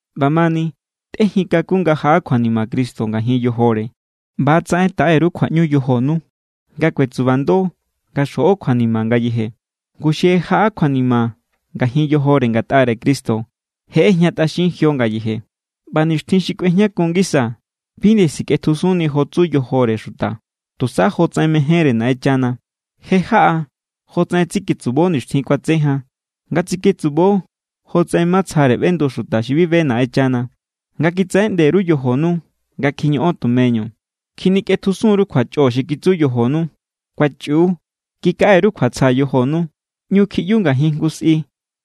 ꞌBamani, tꞌéjin kakun nga jaꞌa kjuanima Cristo ngajin yojore ꞌba=tsaꞌen taꞌe_ru kjuaꞌñu yojonu nga kuetsubando nga xjoꞌo kjuanima ngayeje. Ngu xi je jaꞌa kjuanima ngajin yojore ngatꞌare Cristo, je ꞌejñatꞌaxin jio ngayeje. ꞌBa nixtjin xi kꞌuejñakun ngisa bi nde sikꞌetjusunni jo tsu yojore xuta, tusa jotsaꞌen mejénre Naꞌenchana. Je= jaꞌa jotsaꞌen tsiketsubo nixtjin kuatse jan, nga tsiketsubo jotsaꞌen matsjare ꞌbendu xuta xi bi be Naꞌenchana, nga kitsaꞌeꞌnde_ru yojonu nga kjiñoꞌon tumeñu, kjinikꞌetjusun_ru kjuachꞌo xi kitsu yojonu, kuachꞌiu, kikaꞌe_ru kjuatsja yojonu, ꞌñu kjiꞌyu ngajin jngu sꞌi,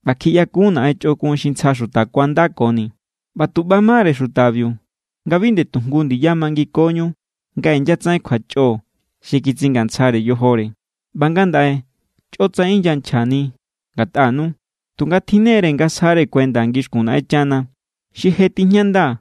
ꞌba kjiꞌyakun naꞌen chꞌokun xi ntsja xuta kuandakoni. ꞌBa tu ꞌba=mare xutabiu nga bi nde tu jngu ndiya mangikoñu nga inyatsaꞌen kjuachꞌo xi kitsingantsjare yojore. ꞌBa ngandaꞌe chꞌotsaꞌen inyachjani ngatꞌanu. Tunga tjinne=re nga sja kuenda ngixkun Naꞌenchana. Xi je tijñanda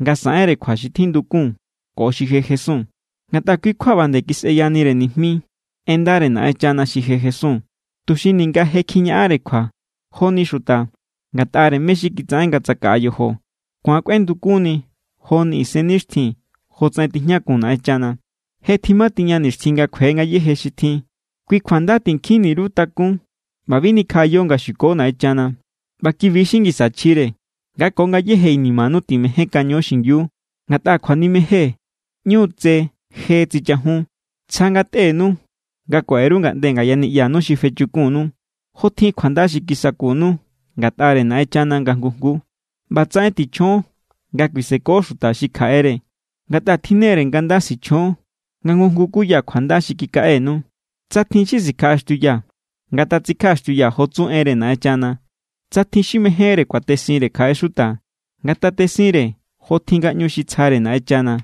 nga saꞌenre kjua xi tjindukun ko xi je jesun. Ngatꞌa kui= kjua ꞌba nde kisꞌeyanire nijmi en ndare Naꞌenchana xi je jesun, tuxi ninga je kjiñaꞌanre kjua joni xuta ngatꞌare mé= xi kitsaꞌen nga tsakaꞌa yojo, ku̱an kꞌuendukunni joni isennixtjin jotsaꞌen tijñakun Naꞌenchana. Je tjima tiña nixtjin nga kjue ngayéje xi tjin. Kui kjua nda tinkjinni_ru kakún ꞌba bi nikjaꞌayo nga xuko Naꞌenchana. ꞌBa kibi= xi ngisa chjire. Nga ko ngayéje inimanu timejénkaño xingiu, ngatꞌa kjuanimejen ꞌñu= tse je tsichajun. Tsja ngatꞌenu nga kuaꞌe_ru ngaꞌnde ngaya niꞌyanu xi fechukunu. Jotjin kjuanda xi kisakunu ngatꞌare Naꞌenchana nga jngu jnguu, ꞌbatsaꞌen tichjon nga kuiseko xuta xi kjaꞌere. Ngatꞌa tjinne=re nga nda sichjon nga jngu jngu kuya kjuanda xi kikaꞌenu. Tsa tjin xi sikjaꞌaxtiuya, ngatatsikjaꞌaxtiuya jo tsu enre Naꞌenchana. Tsa tjin xi mejénre kuatesinre kjaꞌe xuta, ngatatesinre jotjin ngaꞌñu xi tsjare Naꞌenchana.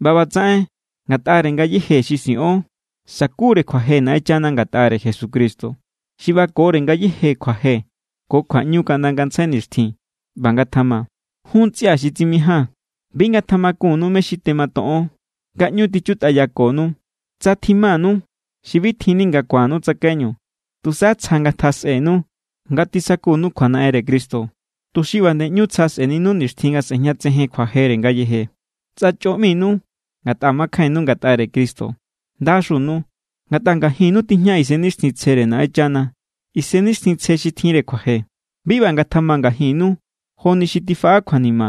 ꞌBa ꞌbatsaꞌen ngatꞌare ngayéje xi siꞌon sa̱kure kjuaje Naꞌenchana ngatꞌare Jesucristo. Xi ꞌbakore ngayéje kjuaje ko kjuaꞌñu kaꞌnda ngantsjai nixtjin. ꞌBa ngatjama. Jun ntsꞌia xi tsimijaa̱n, bi ngatjamakunnu mé= xi tematoꞌon nga ꞌñu tichutꞌayakonu, tsa tjimanu xi bi tjinni nga ku̱annu tsakaiñu. Tusa tsja ngatjasꞌenu nga tisakutꞌanu kjuanaꞌenre Cristo, tuxi ꞌba nde ꞌñu tsja sꞌe̱ninu nixtjin nga sꞌe̱jñatsejen kjuajere ngayeje. Tsa chꞌo ꞌminu ngatꞌa makjainnu ngatꞌare Cristo, ¡ndaxunu! Ngatꞌa ngajinnu tijña Isennixtjintsjere Naꞌenchana, Isennixtjintsje xi tjinre kjuaje. Bi ꞌba ngatjama ngajinnu joni xi tifaꞌa kjuanima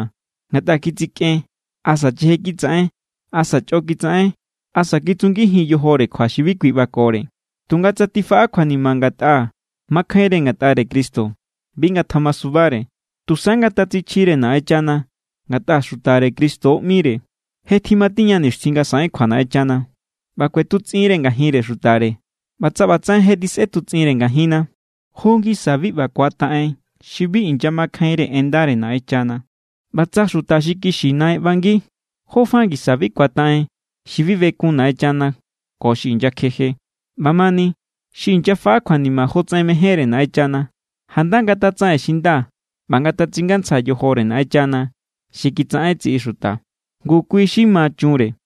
ngatꞌa kitsikꞌen asa cheje kitsaꞌen asa chꞌo kitsaꞌen asa kitsungijin yojore kjua xi bi kui ꞌbakore. Tunga tsa tifaꞌa kjuanima ngatꞌa makjainre ngatꞌare Cristo, bi ngatjamasubare. Tusa ngatatsichjire Naꞌenchana ngatꞌa xutare Cristo ꞌmire. Je tjimatiña nixtjin nga saꞌen kjua Naꞌenchana, ꞌba kꞌuetutsꞌinre ngajinre xutare. ꞌBa tsa ꞌbatsaꞌen je tjisꞌetutsꞌinre ngajinna, ¿jó ngisa bi ꞌba ku̱ataꞌen xi bi inyamakjainre en ndare Naꞌenchana? ꞌBa tsa xuta xi kixi naꞌen ꞌbangi, ¿jó fa ngisa bi ku̱ataꞌen xi bi bekun Naꞌenchana ko xi inyakjeje? ꞌBamani, xi inyafaꞌa kjuanima jotsaꞌen mejénre Naꞌenchana, janda ngatatsaꞌen xi nda ꞌba ngatatsingantsja yojore Naꞌenchana xi kitsaꞌen tsiꞌi xuta. Ngu kui xi ma chunre.